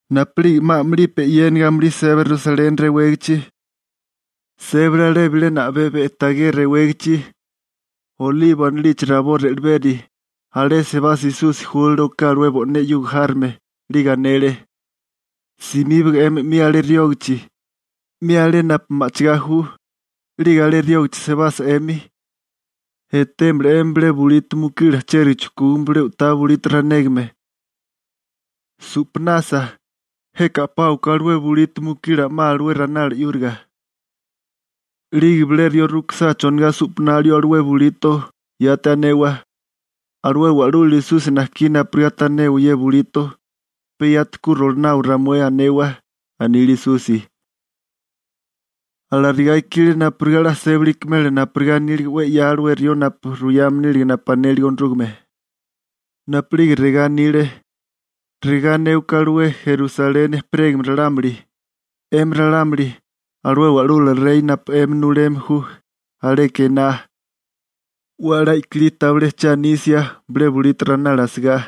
Napu'lige 'ma a'mulipi e'yéniga amulí seba Rusaleni rewégichi, sébale alé bilena a'bé Be'tagé rewégichi, Olibo anilichi rabó re'leberi. Alé sebasa Esusi júlale oká alué bo'né 'yuga járome, 'lige anele: ―Simíbaga 'mi alé riógachi, 'mi alé napu ma'chigá ju, 'lige alé riógichi sebasa 'emi, etémala 'emi bilé bulito mukila chériga chujkúgame bilé u'tá bulito ranégame. Su'panasa, jeka a'páwaká alué bulito mukila 'ma alué ranala 'yúriga. 'Lige bilé rió rukisá chonigá su'panalio alué bulito, yati anewa: «Alué Wa'lula Esusi najkí napurigá tanewa ye bulito, pe yati ku rolonawa ramué», anewa ―anile Esusi. Alarigá ikile napurigá 'la sébali ikimela napurigá anílige 'we 'ya alué rió napu ruyame nílige napu anélige Onorúgame, napu'lige regá anile: Regá anéwaká alué Sioni (Rusaleni) ejperégame ralámuli: «'Emi ralámuli, alué wa'lula rey napu 'emi nuleme ju, aleka ená, 'we a'lá i'kilí tabilé che anisia, bilé bulito ranala asigá.››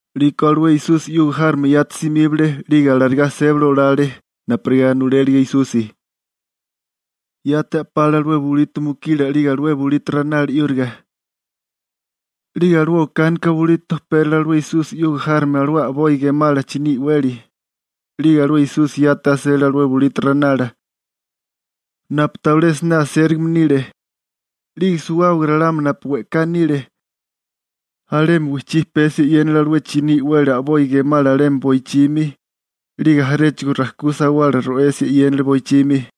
'Liko alué Esusi 'yuga járome yati simíbale 'lige alarigá sébali olale napurigá nulélige Esusi. Yati a'pale alué bulito mukila 'lige alué bulito ranala 'yúriga, 'lige alué okánika bulito pérale alué Esusi 'yuga járome alué a'boi gemala chiní i'weli, 'lige alué Esúsika yati asele bulito ranala, napu tabilé siné asérigame nile. 'Lige suwábaga ralámuli napu we'ká nile, alemi wijchí pesia e'yénale alué chiní i'weli a'boi gemala alemi boichimi, 'lige jaréchigo rajkú sawala ro'asia e'yénale boichimi.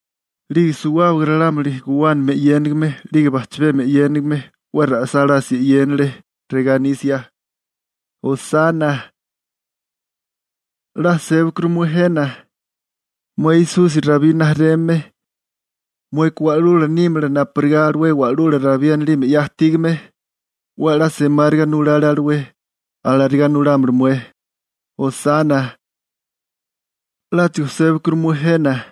'Lige suwábaga ralámuli guwánami e'yénigime 'lige bajchabemi e'yénigime 'we ra'sálásia e'yénale regá anisia: ―¡Hosana (salva)! ¡'La sébakuru mué jena! ¡Mué Esusi Rabí rijimala, mueka wa'lula nímala napurigá alué wa'lula Rabí anilime 'ya ajtígame! ¡'We a'lá semáriga nulale alué, alarigá nulámala mué! ¡Hosana! ¡'Láchigo sébakuru mué jena!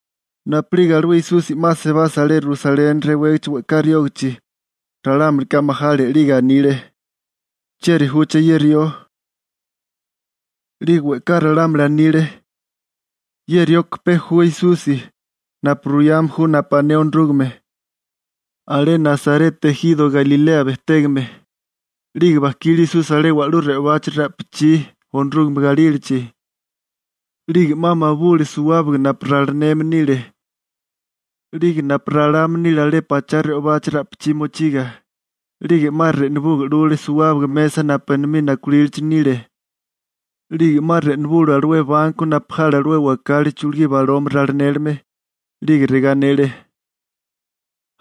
Napu'lige alué Esusi 'ma sebasa alé Rusaleni rewégichi we'ká riógichi, ralámulika majale 'lige anile: ―¿Chieri júché ye rió? 'Lige we'ká ralámuli anile: ―Ye rioka pe ju Esusi, napu ruyame ju napu ané Onorúgame, alé Nasareta ejiro Galilea bejtégame. 'Lige bajkile Esusi alé wa'lú re'obachi ra'pichí Onorúgame galílachi, 'lige 'ma mabule suwábaga napu ralineme nile, 'lige napu ralame nile alé pachá re'obachi ra'pichí mochiga, 'lige 'ma re'nubuga 'lule suwábaga mesa napu enomí nakulílichi nile, 'lige 'ma re'nubule alué banko napu jale alué wakali chulugí baloma ralinélime. 'Lige regá anele: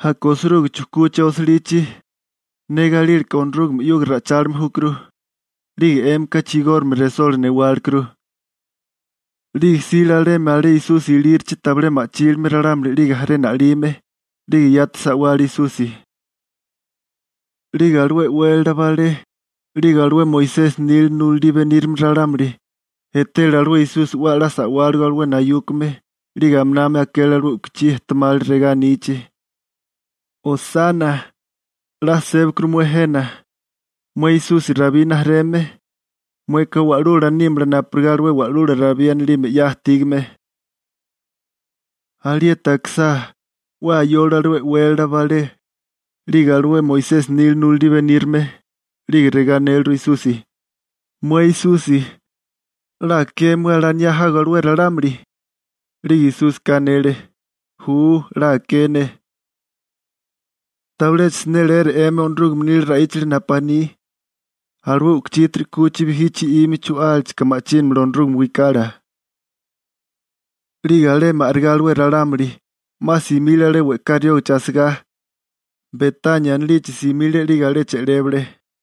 ―Aka osiruga chujkúché osilichi: «Ne galílaká Onorúgame 'yuga ra'ichálime júkuru», 'lige 'émika chigórigame resola newálekuru. 'Lige jsile alemi alé Esusi ilírachi tabilé ma'chílime ralámuli 'lige jaré na'lime, 'lige yati sa'wale Esusi. 'Lige alué e'wélala balé 'lige alué Moisesi nila nulalí benírame ralámuli etele alué Esusi 'we a'lá sa'wáligo alué nayúkame, 'lige aminami akele alué u'kuchí ejtemali regá anichi: ―¡Hosana! ¡'La sébakuru mué jena! ¡Mué Esusi Rabí rijimala, mueka wa'lula nímala napurigá alué Wa'lula Rabí anilime 'ya ajtígame! Alieti akisá, 'we ayole alué e'wélala balé 'lige alué Moisesi nila nulalí benírame, 'lige regá anéliru Esusi: ―Mué Esusi, ¿'la aké mué alaniá jago alué ralámuli? 'Lige Esúsika anele: ―Ju, 'la aké ne. ¿Tabilecha siné leera 'emi Onorúgame nila ra'íchalichi napu aní: Alué u'kuchítiri 'kuchi bijí chi'ime chu'álachika ma'chínamala Onorúgame wikala? 'Lige alemi a'rigá alué ralámuli, 'ma simile alé we'ká riógachi asigá, Betania anilichi simile 'lige alé che'lébale.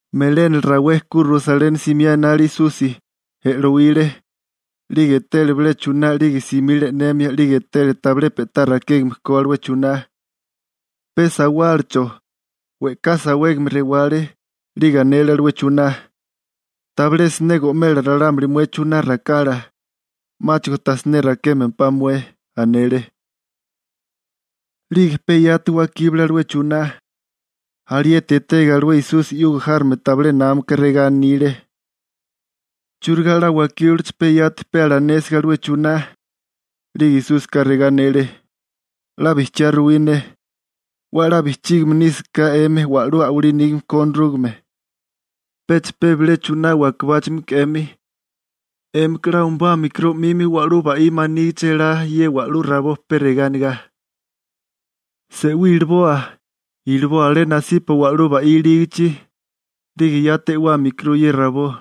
Melénala rawé ku Rusaleni simiá enale Esusi, e'lowile. 'Lige etele bilé chuná 'lige simile e'nemia 'lige etele tabilé pe'tá rakégame ko alué chuná, pe sawálacho, we'ká sawégame rewale, 'lige anele alué chuná: ―¡Tabilé siné go'mela ralámuli mué chuná rakala, 'máchigo ta siné rakémempá mué! ―anele. 'Lige pe yati wakíbale alué chuná. Alieti etega alué Esusi 'yuga járome tabilé námaka regá anile: ―¿Churigá 'la wakíbalaché pe yati pe alanésiga alué chuná? 'Lige Esúsika regá anele: ―'La bijchiá ruwí ne, 'we a'lá bijchígime nísaká 'emi wa'lú a'walí nígame ko Onorúgame, pecha pe bilé chuná wakebáchimiko 'emi, 'émika 'la umabámikuru 'mimi wa'lú ba'wí manígichi elá ye wa'lú rabó pe regá anegá: «Se'wí iliboa, iliboa alé nasipa wa'lú ba'wí ilígichi», 'lige yati e'wámikuru ye rabó.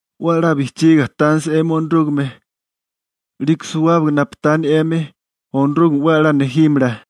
'We a'lá bijchígiga tánisa 'emi Onorúgame, 'liko suwábaga napu tani 'emi, Onorúgame 'we a'lá nejímala.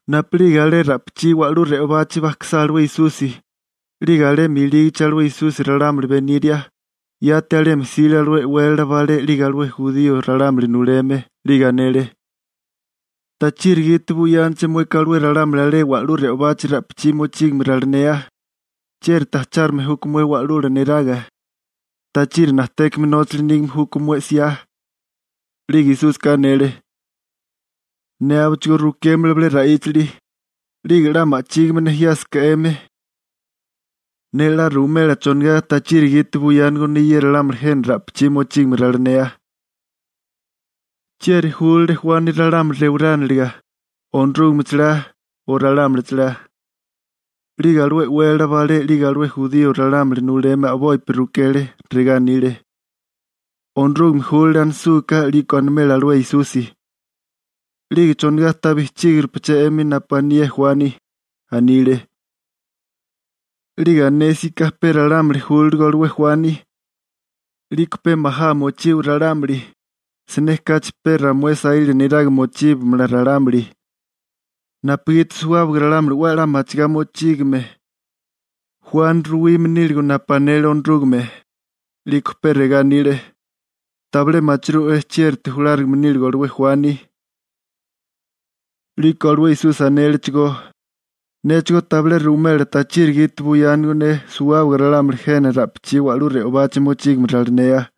Napu'lige alé ra'pichí wa'lú re'obachi bajkisá alué Esusi, 'lige alemi ilígichi alué Esusi ralámuli beniria, yati alemi jsile alué e'wélala balé 'lige alué jurío ralámuli nuleme, 'lige anele: ―¿Tachiri gite buyánaché mueka alué ralámuli alé wa'lú re'obachi ra'pichí mochígame ralinea? ¿Chiérite ajchárigame júkó mué Wa'lula neraga? ¿Tachiri najtékame nóchali nígame júkó mué 'siá? 'Lige Esúsika anele: ―Ne abichigó rukémala bilé ra'íchali, 'lige 'la ma'chígime nejiásaká 'emi, ne 'la ruwimela chonigá tachiri gite buyánigo ne ralámuli jena ra'pichí mochígame ralinea. ¿Chieri júlale Juani ralámuli rewarániliga, Onorúgame chalá o ralámuli chalá? 'Lige alué e'wélala balé 'lige alué jurío ralámuli nuleme a'bopi rukele, regá anile: ―Onorúgame júlale anisúká 'liko animela alué Esusi: «¿'Lige chonigá ta bijchígirupaché 'emi napu anié Juani?» anile. 'Lige anésiká pe ralámuli júlaligo alué Juani, 'liko pe majá mochiwa ralámuli, siné kachi pe ramué saíla niraga mochíbamala ralámuli, napugiti suwábaga ralámuli 'we a'lá machigá mochígame Juani ruwime níligo napu anele Onorúgame. 'Liko pe regá anile: ―Tabilé machirú'é chiérite julárigame níligo alué Juani. 'Liko alué Esusi anélechigó: ―Néchigó tabilé ruwimela tachiri gite buyánigo ne suwábaga ralámuli jena ye ra'pichí wa'lú re'obachi mochígame ralinea. ›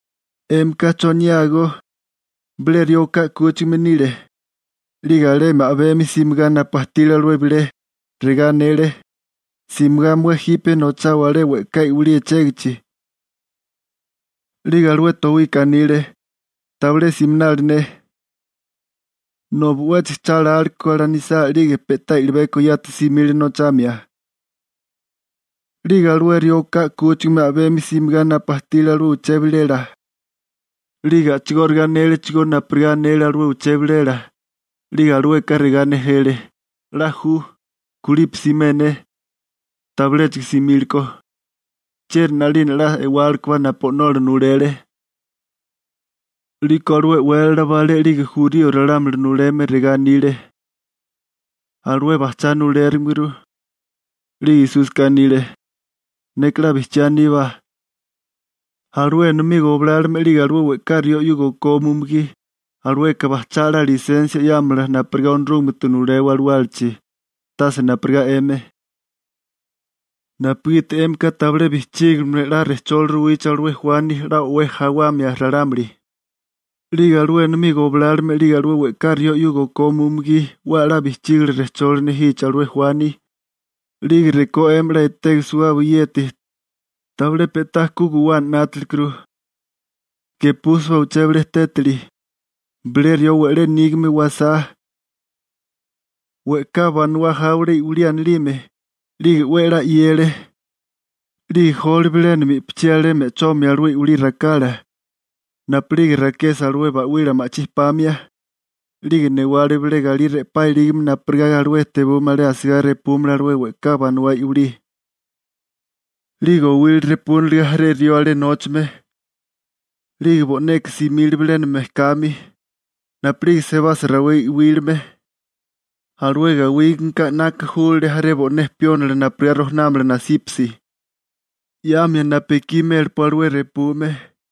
'Émika ¿choniágó? Bilé rió oká 'kúchigame nile, 'lige alemi a'bemi simigá napu ajtile alué bilé, regá anele: «Simigá mué jipe nochawa alé we'ká i'wilí echégichi.» 'Lige alué towika anile: «¡Tabilé siminali ne!» Nobi 'wéchigo cha lálekó alanisá 'lige pe'tá i'libeko yati simile nochamia. 'Lige alué rió o'ká 'kúchigame a'bemi simigá napu ajtile alué uché bilela, 'lige a'chigóriga anélechigó napurigá anélige alué uché bilela, 'lige alueka regá nejele: «'La ju, kulipi simé ne.» Tabiléchigo simílekó. ¿Chieri 'nalina 'la e'wálekobá napu o'nola nulele? 'Liko alué e'wélala balé 'lige jurío ralámuli nuleme regá anile: ―Alué bajchá nulérimeguru. 'Lige Esúsika anile: ―Neka 'la bijchiá aníbá, alué enomí goblálome 'lige alué we'ká rió 'yuga okome umugí, alueka bajchá 'la lisensia 'yámala napurigá Onorúgamete nulewa alawálachi, tase napurigá 'emi, napugiti 'émika tabilé bijchígiligame 'la rejcholi ruwichi alué Juani 'la o'wé jawamia ralámuli, 'lige alué enomí goblálome 'lige alué we'ká rió 'yuga okome umugí 'we a'lá bijchígile rejcholi nejichi alué Juani, 'lige rekó 'emi 'la etege suwágaba yeti, tabilé pe'tá ku guwana 'nátalekuru. › Gepúsibá uché bilé tétali: Bilé rió we'lé nígame wajsá. We'ká banawá jáwale i'wilí anilime, 'lige 'we a'lá 'yele, 'lige jole bilénami i'pichí alé me'chomia alué i'wilí rakala, napu'lige rakesa alué ba'wila ma'chí pamia, 'lige newale bilé galí re'pá ilígame napurigá alué tebume alé asigá repúmala alué we'ká banawá i'wilí. › 'Lige owile repúniliga jaré rió alé nóchame, 'lige bo'neka simile bilénami mejkami. Napu'lige sebasa rawé i'wíliame, alué gawígameka 'naka júlale jaré bo'né piónila napurigá rojanámala nasípasi, 'yamia napu ekí mélapá alué repume.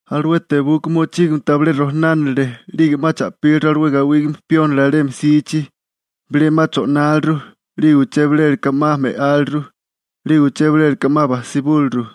Alué tebuka mochígameka tabilé rojanánile 'lige 'ma cha'píliru alué gawígame piónila alemi jsichi. Bilé 'ma cho'náliru, 'lige uché bilela ka 'ma me'áliru, 'lige uché bilela ka 'ma bajsibúliru.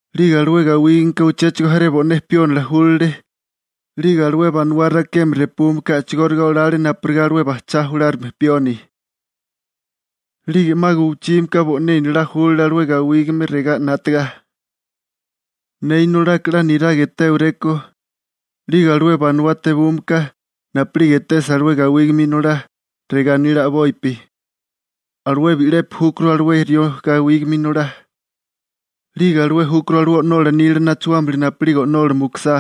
'Lige alué gawígame ka uchéchigo jaré bo'né piónila júlale, 'lige alué banawá rakeme repume ka a'chigóriga olale napurigá alué bajchá julárigame pioni. › 'Lige 'ma guwichímiká bo'né inolá júlale alué gawígame regá 'nátaga: «Ne inolaka 'la niraga etéwarékó.» 'Lige alué banawá tebume ka, napu'lige etesa alué gawígame inolá, regá anile a'bopi: «Alué bi'lepi júkuru alué rió gawígame inolá, 'lige alué júkuru alué o'nola nila nachuámili napu'lige o'nola mukusá,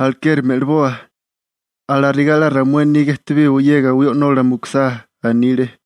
alekeri me'liboa. Alarigá 'la ramué niga ejtebiwa ye gawí o'nola mukusá», anile.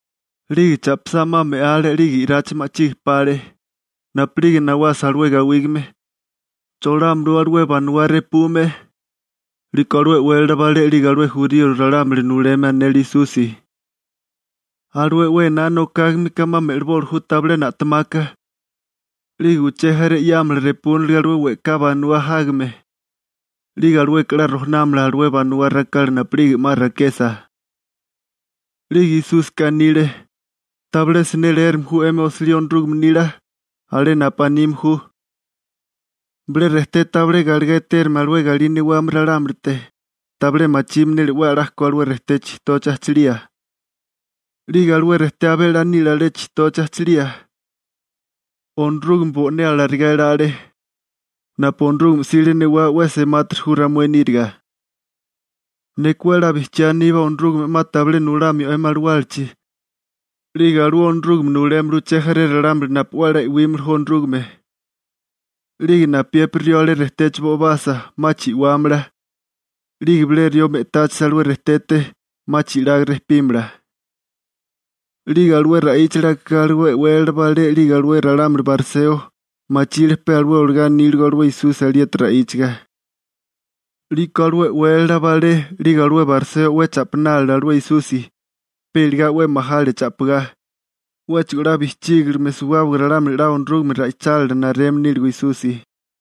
'Lige cha'pisá 'ma me'ale 'lige i'rachi ma'chige pale. › Napu'lige nawasa alué gawígame, ¿cholámalawé alué banawá repume? 'Liko alué e'wélala balé 'lige alué jurío ralámuli nuleme anele Esusi: ―Alué 'we ená nokágame ka 'ma me'liboli ju tabilé na'temaka, 'lige uché jaré 'yámala repúniliga alué we'ká banawá jágame, 'lige alueka 'la rojanámala alué banawá rakala napu'lige 'ma rakesa. 'Lige Esúsika anile: ―¿Tabilé siné leérame ju 'emi osilí Onorúgame nila?, alé napu anime ju: Bilé rejté tabilé galegá etérigame alué galí newame ralámulite tabilé machime nile 'we a'lá ko alué rejté chijtochi ajchilía. 'Lige alué rejté abé a'lá nile alé chijtochi ajchalía. Onorúgame bo'né alarigá elale. Napu Onorúgame 'sile newá 'we a'lá semátiri ju ramué níriga. › Neka 'we a'lá bijchiá aníbá Onorúgame 'ma tabilé nulamio 'emi alawálachi, 'lige alué Onorúgame nulémala uché jaré ralámuli napu 'we a'lá e'wímili ju Onorúgame. 'Lige napiépiri rió alé rejtechi bo'ibasa, 'ma chi'wámala. 'Lige bilé rió me'táchisa alué rejtete, 'ma chi'laga rejpímala. 'Lige alué ra'íchali akigá alué e'wélala balé 'lige alué ralámuli bariseo, machile pe alué olagá aníligo alué Esusi alieti ra'íchaga. 'Liko alué e'wélala balé 'lige alué bariseo 'we cha'pinálile alué Esusi, pe iligá 'we majale cha'pigá, 'wéchigo 'la bijchígilime suwábaga ralámuli 'la Onorúgame ra'ichálila nareme níligo Esusi.